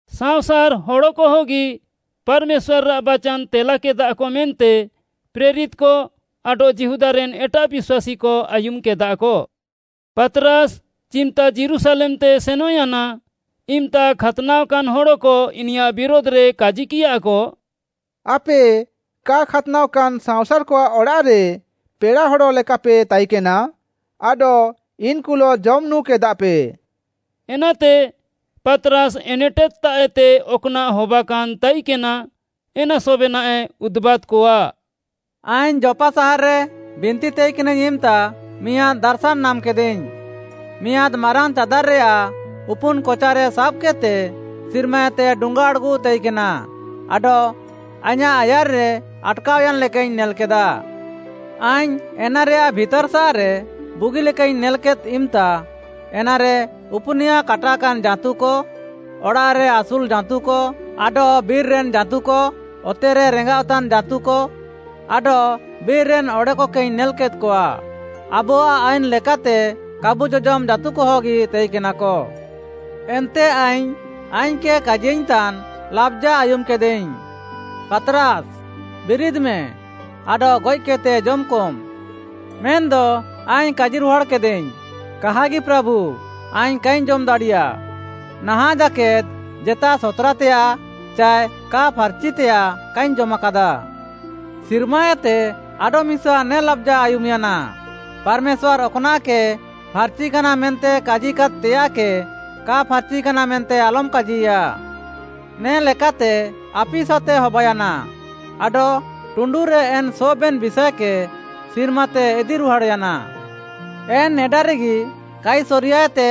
ସାଅଁସାର୍‌ ହଡ଼କହଗି ପାର୍‌ମେଶ୍ୱାର୍‌ଆଃ ବାଚାନ୍‌ ତେଲାକେଦାକ ମେନ୍ତେ ପ୍ରେରିତ୍‌କ ଆଡଃ ଯିହୁଦାରେନ୍‌ ଏଟାଃ ବିଶ୍ୱାସୀକ ଆୟୁମ୍‌କେଦାକ। ପାତ୍‌ରାସ୍‌ ଚିମ୍‌ତା ଯୀରୁଶାଲେମ୍‌ତେ ସେନଃୟାନା, ଇମ୍‌ତା ଖାତ୍‌ନାଅକାନ୍‌ ହଡ଼କ ଇନିୟାଃ ବିରୁଧ୍‌ରେ କାଜିକିୟାକ, “ଆପେ କା ଖାତ୍‌ନାଅକାନ୍‌ ସାଅଁସାର୍‌କଆଃ ଅଡ଼ାଃରେ ପେଡ଼ାହଡ଼ ଲେକାପେ ତାଇକେନା ଆଡଃ ଇନ୍‌କୁଲଃ ଜମ୍‌ ନୁଁକେଦାପେ।” ଏନାତେ ପାତ୍‌ରାସ୍‌ ଏନେଟେଦ୍‌ତାଃଏତେ ଅକ୍‌ନାଃ ହବାକାନ୍‌ ତାଇକେନା, ଏନା ସବେନାଃଏ ଉଦୁବାଦ୍‌କଆ, “ଆଇଙ୍ଗ୍‌ ଯୋପ୍‌ପା ସାହାର୍‌ରେ ବିନ୍ତି ତାଇକେନାଇଙ୍ଗ୍‌ ଇମ୍‌ତା ମିଆଁଦ୍‌ ଦାର୍‌ଶାନ୍‌ ନାମ୍‌କେଦାଇଙ୍ଗ୍‌। ମିଆଁଦ୍‌ ମାରାଙ୍ଗ୍‌ ଚାଦାର୍‌ରେୟାଃ ଉପୁନ୍‌ କଚାରେ ସାବ୍‌କେଦ୍‌ତେ ସିର୍ମାଏତେ ଡୁଙ୍ଗାଆଡ଼୍‌ଗୁଃ ତାଇକେନା ଆଡଃ ଆଇଁୟାଃ ଆୟାର୍‌ରେ ଆଟ୍‌କାଅୟାନ୍‌ ଲେକାଇଙ୍ଗ୍‌ ନେଲ୍‌କେଦା। ଆଇଙ୍ଗ୍‌ ଏନାରେୟାଃ ଭିତାର୍‌ସାଃରେ ବୁଗିଲେକାଇଙ୍ଗ୍‌ ନେଲ୍‌କେଦ୍‌ ଇମ୍‌ତା, ଏନାରେ ଉପୁନିୟା କାଟାକାନ୍‌ ଜାଁତୁକ, ଅଡ଼ାଃରେ ଆସୁଲ୍‌ ଜାଁତୁକ ଆଡଃ ବିର୍‌ରେନ୍‌ ଜାଁତୁକ, ଅତେରେ ରେଙ୍ଗାଅଃତାନ୍‌ ଜାଁତୁକ ଆଡଃ ବିର୍‌ରେନ୍‌ ଅଡ଼େକକେଇଙ୍ଗ୍‌ ନେଲ୍‌କେଦ୍‌କଆ। ଆବୁଆଃ ଆଇନ୍‌ ଲେକାତେ କାବୁ ଜଜମ୍‌ ଜାଁତୁକହଗି ତାଇକେନାକ। ଏନ୍ତେ ଆଇଙ୍ଗ୍‌, ଆଇଙ୍ଗ୍‌କେ କାଜିୟାଇଙ୍ଗ୍‌ତାନ୍‌ ଲାବ୍‌ଜା ଆୟୁମ୍‌କେଦାଇଙ୍ଗ୍‌, ‘ପାତ୍‌ରାସ୍‌, ବିରିଦ୍‌ମେ, ଆଡଃ ଗଏଃକେଦ୍‌ତେ ଜମ୍‌କମ୍‌।’ ମେନ୍‌ଦ ଆଇଙ୍ଗ୍‌ କାଜିରୁହାଡ଼୍‌କେଦାଇଙ୍ଗ୍‌, ‘କାହାଗି ପ୍ରାଭୁ, ଆଇଙ୍ଗ୍‌ କାଇଙ୍ଗ୍‌ ଜମ୍‌ ଦାଡ଼ିୟା। ନାହାଁଃ ଜାକେଦ୍‌ ଜେତା ସତ୍‌ରାତେୟାଃ ଚାଏ କା ଫାର୍‌ଚିତେୟାଃ କାଇଙ୍ଗ୍‌ ଜମାକାଦା।’ ସିର୍ମାଏତେ ଆଡଃମିସା ନେ ଲାବ୍‌ଜା ଆୟୁମ୍‌ୟାନା, ‘ପାର୍‌ମେଶ୍ୱାର୍‌ ଅକ୍‌ନାଃକେ ଫାର୍‌ଚିକାନା ମେନ୍ତେ କାଜିକାଦ୍‌ତେୟାଃକେ କା ଫାର୍‌ଚିକାନା ମେନ୍ତେ ଆଲମ୍‌ କାଜିୟା।’ ନେ'ଲେକା ଆପିସାତେ ହବାୟାନା, ଆଡଃ ଟୁଣ୍ଡୁରେ ଏନ୍‌ ସବେନ୍‌ ବିଷାଏକେ ସିର୍ମାତେ ଇଦି ରୁହାଡ଼୍‌ୟାନା। ଏନ୍‌ ନେଡାରେଗି, କାଇସରିୟାଏତେ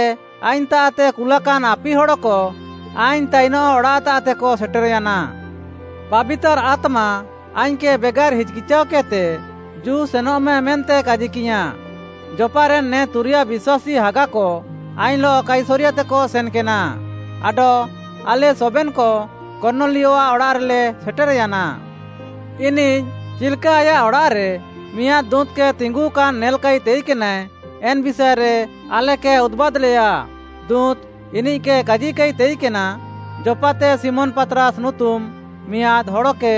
ଆଇଙ୍ଗ୍‌ତାଃତେ କୁଲାକାନ୍‌ ଆପିହଡ଼କ ଆଇଙ୍ଗ୍‌ ତାଇନଃ ଅଡ଼ାଃତାଃତେକ ସେଟେର୍‌ୟାନା। ପାବିତାର୍‌ ଆତ୍ମା ଆଇଙ୍ଗ୍‌କେ ବେଗାର୍‌ ହିଚ୍‌କିଚାଅକେଦ୍‌ତେ ଜୁ ସେନଃମେ ମେନ୍ତେ କାଜିକିୟାଁ। ଯୋପ୍‌ପାରେନ୍‌ ନେ ତୁରିୟା ବିଶ୍ୱାସୀ ହାଗାକ ଆଇଙ୍ଗ୍‌ଲଃ କାଇସରିୟାତେକ ସେନ୍‌କେନା ଆଡଃ ଆଲେ ସବେନ୍‌କ କର୍ଣ୍ଣଲିୟଆଃ ଅଡ଼ାଃରେଲେ ସେଟେର୍‌ୟାନା। ଇନିଃ ଚିଲ୍‌କା ଆୟାଃ ଅଡ଼ାଃରେ ମିଆଁଦ୍‌ ଦୁଁତ୍‌କେ ତିଙ୍ଗୁକାନ୍‌ ନେଲାକାଇ ତାଇକେନାଏ, ଏନ୍‌ ବିଷାଏରେ ଆଲେକେ ଉଦୁବାଦ୍‌ଲେୟା। ଦୁଁତ୍‌ ଇନିଃକେ କାଜିକାଇ ତାଇକେନା, ‘ଯୋପ୍‌ପାତେ ଶିମୋନ୍‌ ପାତ୍‌ରାସ୍‌ ନୁତୁମ୍‌ ମିଆଁଦ୍‌ ହଡ଼କେ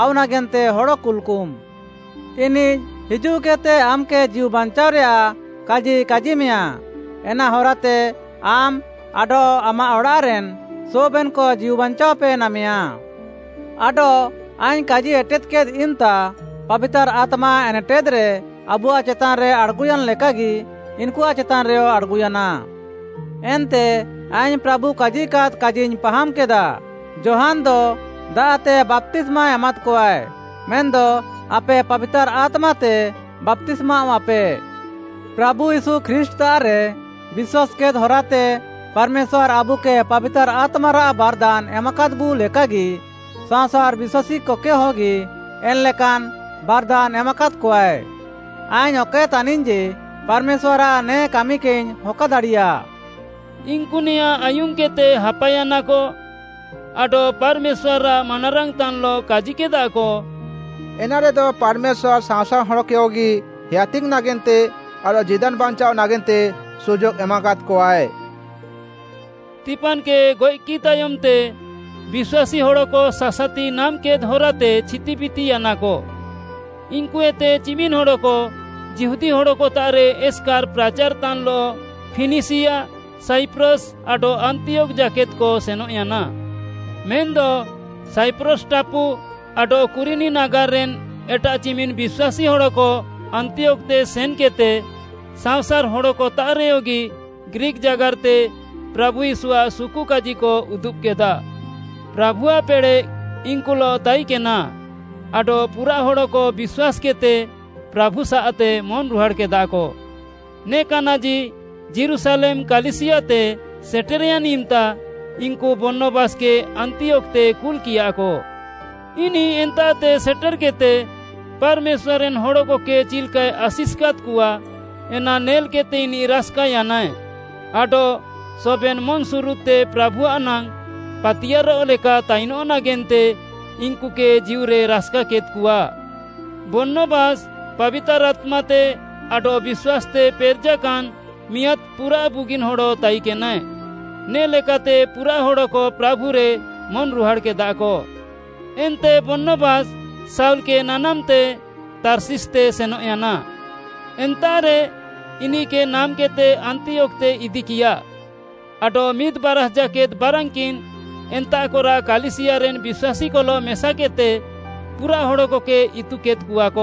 ଆଉ ନାଗେନ୍ତେ ହଡ଼ କୁଲ୍‌କମ୍‌। ଇନିଃ ହିଜୁଃକେଦ୍‌ତେ ଆମ୍‌କେ ଜୀଉବାଞ୍ଚାଅରେୟାଃ କାଜି କାଜିମେୟାଁ, ଏନା ହରାତେ ଆମ୍‌ ଆଡଃ ଆମାଃ ଅଡ଼ାଃରେନ୍‌ ସବେନ୍‌କ ଜୀଉବାଞ୍ଚାଅପେ ନାମେୟା।’ ଆଡଃ ଆଇଙ୍ଗ୍‌ କାଜି ଏଟେଦ୍‌କେଦ୍‌ ଇମ୍‌ତା, ପାବିତାର୍‌ ଆତ୍ମା ଏନେଟେଦ୍‌ରେ ଆବୁଆଃ ଚେତାନ୍‌ରେ ଆଡ଼୍‌ଗୁୟାନ୍‌ ଲେକାଗି ଇନ୍‌କୁଆଃ ଚେତାନ୍‌ରେୟ ଆଡ଼୍‌ଗୁୟାନା। ଏନ୍ତେ ଆଇଙ୍ଗ୍‌ ପ୍ରାଭୁ କାଜିକାଦ୍‌ କାଜିଇଙ୍ଗ୍‌ ପାହାମ୍‍କେଦା, ‘ଯୋହାନ୍‌ଦ ଦାଆଃତେ ବାପ୍ତିସ୍ମା ଏମାଦ୍‌କଆଏ, ମେନ୍‌ଦ ଆପେ ପାବିତାର୍‌ ଆତ୍ମାତେ ବାପ୍ତିସ୍ମାୱାଃପେ।’ ପ୍ରାଭୁ ୟୀଶୁ ଖ୍ରୀଷ୍ଟ୍‌ତାଃରେ ବିଶ୍ୱାସ୍‌କେଦ୍‌ ହରାତେ ପାର୍‌ମେଶ୍ୱାର୍‌ ଆବୁକେ ପାବିତାର୍‌ ଆତ୍ମାରାଃ ବାର୍‌ଦାନ୍‌ ଏମାକାଦ୍‌ବୁ ଲେକାଗି ସାଅଁସାର୍‌ ବିଶ୍ୱାସୀକକେହଗି ଏନ୍‌ଲେକାନ୍‌ ବାର୍‌ଦାନ୍‌ ଏମାକାଦ୍‌କଆଏ, ଆଇଙ୍ଗ୍‌ ଅକଏ ତାନିଙ୍ଗ୍‌ ଯେ ପାର୍‌ମେଶ୍ୱାର୍‌ଆଃ ନେ କାମିକେଇଙ୍ଗ୍‌ ହକାଦାଡ଼ିୟା।” ଇନ୍‌କୁ ନେଆଁ ଆୟୁମ୍‌କେଦ୍‌ତେ ହାପାୟାନାକ ଆଡଃ ପାର୍‌ମେଶ୍ୱାର୍‌ଆଃ ମାନାରାଙ୍ଗ୍‌ତାନ୍‌ଲଃ କାଜିକେଦାକ, “ଏନାରେଦ ପାର୍‌ମେଶ୍ୱାର୍‌ ସାଅଁସାର୍‌ ହଡ଼କକେୟଗି ହେୟାତିଙ୍ଗ୍‌ ନାଗେନ୍ତେ ଆଡଃ ଜୀଦାନ୍‌ ବାଞ୍ଚାଅଃ ନାଗେନ୍ତେ ସୁଯୋଗ୍‌ ଏମାକାଦ୍‌କଆଏ।” ସ୍ତିଫାନ୍‌କେ ଗଏଃକିଃ ତାୟମ୍‌ତେ ବିଶ୍ୱାସୀ ହଡ଼କ ସାସାତି ନାମ୍‌କେଦ୍‌ ହରାତେ ଛିତିବିତିୟାନାକ, ଇନ୍‌କୁଏତେ ଚିମିନ୍‌ ହଡ଼କ ଯିହୁଦୀ ହଡ଼କତାଃରେ ଏସ୍‌କାର୍‌ ପ୍ରାଚାର୍‌ତାନ୍‌ଲଃ ଫିନିସିୟା, ସାଇପ୍ରସ୍‌ ଆଡଃ ଆନ୍ତିୟୋଖ୍‌ ଜାକେଦ୍‌କ ସେନଃୟାନା। ମେନ୍‌ଦ ସାଇପ୍ରସ୍‌ ଟାପୁ ଆଡଃ କୁରିନି ନାଗାର୍‌ରେନ୍‌ ଏଟାଃ ଚିମିନ୍‌ ବିଶ୍ୱାସୀ ହଡ଼କ ଆନ୍ତିୟୋଖ୍‌ତେ ସେନ୍‌କେଦ୍‌ତେ ସାଅଁସାର୍‌ ହଡ଼କତାଃରେୟଗି ଗ୍ରୀକ୍‌ ଜାଗାର୍‌ତେ ପ୍ରାଭୁ ୟୀଶୁଆଃ ସୁକୁକାଜିକ ଉଦୁବ୍‌କେଦା। ପ୍ରାଭୁଆଃ ପେଡ଼େଃ ଇନ୍‌କୁଲଃ ତାଇକେନା ଆଡଃ ପୁରାଃ ହଡ଼କ ବିଶ୍ୱାସ୍‌କେଦ୍‌ତେ ପ୍ରାଭୁସାଃତେ ମନ୍‌ରୁହାଡ଼୍‌କେଦାକ। ନେ କାନାଜି ଯୀରୁଶାଲେମ୍‌ କାଲିସିୟାତେ ସେଟେର୍‌ୟାନ୍‌ ଇମ୍‌ତା, ଇନ୍‌କୁ ବର୍ଣ୍ଣବାସ୍‌କେ ଆନ୍ତିୟୋଖ୍‌ତେ କୁଲ୍‌କିୟାକ। ଇନିଃ ଏନ୍ତାଃତେ ସେଟେର୍‌କେଦ୍‌ତେ ପାର୍‌ମେଶ୍ୱାର୍‌ ଏନ୍‌ ହଡ଼କକେ ଚିଲ୍‌କାଏ ଆଶିଷ୍‌କାଦ୍‌କଆ, ଏନା ନେଲ୍‌କେଦ୍‌ତେ ଇନିଃ ରାସ୍‌କାୟାନାଏ ଆଡଃ ସବେନ୍‌ ମନ୍‌ସୁରୁଦ୍‌ତେ ପ୍ରାଭୁଆଃ ନାଙ୍ଗ୍‌ ପାତିୟାର୍‌ରଃ ଲେକା ତାଇନଃ ନାଗେନ୍ତେ ଇନ୍‌କୁକେ ଜୀଉରେ ରାସ୍‌କାକେଦ୍‌କଆ। ବର୍ଣ୍ଣବାସ୍‌ ପାବିତାର୍‌ ଆତ୍ମାତେ ଆଡଃ ବିଶ୍ୱାସ୍‌ତେ ପେରେଜାକାନ୍‌ ମିଆଁଦ୍‌ ପୁରାଃ ବୁଗିନ୍‌ ହଡ଼ ତାଇକେନାଏ। ନେ'ଲେକାତେ ପୁରାଃ ହଡ଼କ ପ୍ରାଭୁରେ ମନ୍‌ରୁହାଡ଼୍‌କେଦାକ। ଏନ୍ତେ ବର୍ଣ୍ଣବାସ୍‌, ଶାଉଲ୍‌କେ ନାନାମ୍‌ତେ ତାର୍ଷିସ୍‌ତେ ସେନଃୟାନା। ଏନ୍ତାଃରେ ଇନିଃକେ ନାମ୍‌କେଦ୍‌ତେ ଆନ୍ତିୟୋଖ୍‌ତେ ଇଦିକିୟା। ଆଡଃ ମିଦ୍‌ ବାରାଷ୍‌ ଜାକେଦ୍‌ ବାରାନ୍‌କିନ୍‌ ଏନ୍ତାଃକରାଃ କାଲିସିୟାରେନ୍‌ ବିଶ୍ୱାସୀକଲଃ ମେସାକେଦ୍‌ତେ ପୁରାଃ ହଡ଼କକେ ଇତୁକେଦ୍‌କଆକ।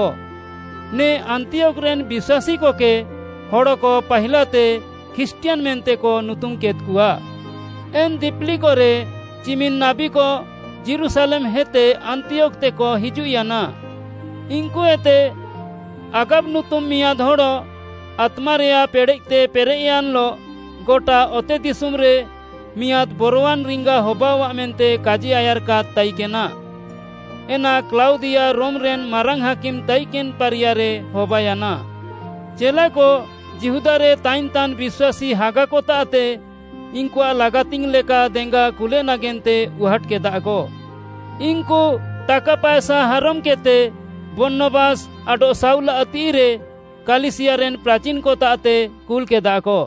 ନେ ଆନ୍ତିୟୋଖ୍‌ରେନ୍‌ ବିଶ୍ୱାସୀକକେ ହଡ଼କ ପାହିଲାତେ ଖ୍ରୀଷ୍ଟିୟାନ୍‌ ମେନ୍ତେକ ନୁତୁମ୍‌କେଦ୍‌କଆ। ଏନ୍‌ ଦିପିଲିକରେ ଚିମିନ୍‌ ନାବୀକ ଯୀରୁଶାଲେମ୍‌ହେତେ ଆନ୍ତିୟୋଖ୍‌ତେକ ହିଜୁଃୟାନା। ଇନ୍‌କୁଏତେ ଆଗାବ ନୁତୁମ୍‌ ମିଆଁଦ୍‌ ହଡ଼ ଆତ୍ମାରେୟାଃ ପେଡ଼େଃତେ ପେରେଃୟାନ୍‌ଲଃ ଗଟା ଅତେଦିଶୁମ୍‌ରେ ମିଆଁଦ୍‌ ବରୱାନ୍‌ ରିଙ୍ଗା ହବାଅଃଆ ମେନ୍ତେ କାଜିଆୟାର୍‌କାଦ୍‌ ତାଇକେନା। ଏନା କ୍ଲାଉଦିଆ ରୋମ୍‌ରେନ୍‌ ମାରାଙ୍ଗ୍‌ ହାକିମ୍‌ ତାଇକେନ୍‌ ପାରିୟାରେ ହବାୟାନା। ଚେଲାକ ଯିହୁଦାରେ ତାଇନ୍‌ତାନ୍‌ ବିଶ୍ୱାସୀ ହାଗାକତାଃତେ ଇନ୍‌କୁଆଃ ଲାଗାତିଙ୍ଗ୍‌ ଲେକା ଦେଙ୍ଗା କୁଲେ ନାଗେନ୍ତେ ଉହାଟ୍‌କେଦାକ। ଇନ୍‌କୁ ଟାକା ପାଏସା ହାରମ୍‌କେଦ୍‌ତେ ବର୍ଣ୍ଣବାସ୍‌ ଆଡଃ ଶାଉଲ୍‌ଆଃ ତିଃଇରେ କାଲିସିୟାରେନ୍‌ ପ୍ରାଚିନ୍‌କତାଃତେ କୁଲ୍‌କେଦାକ।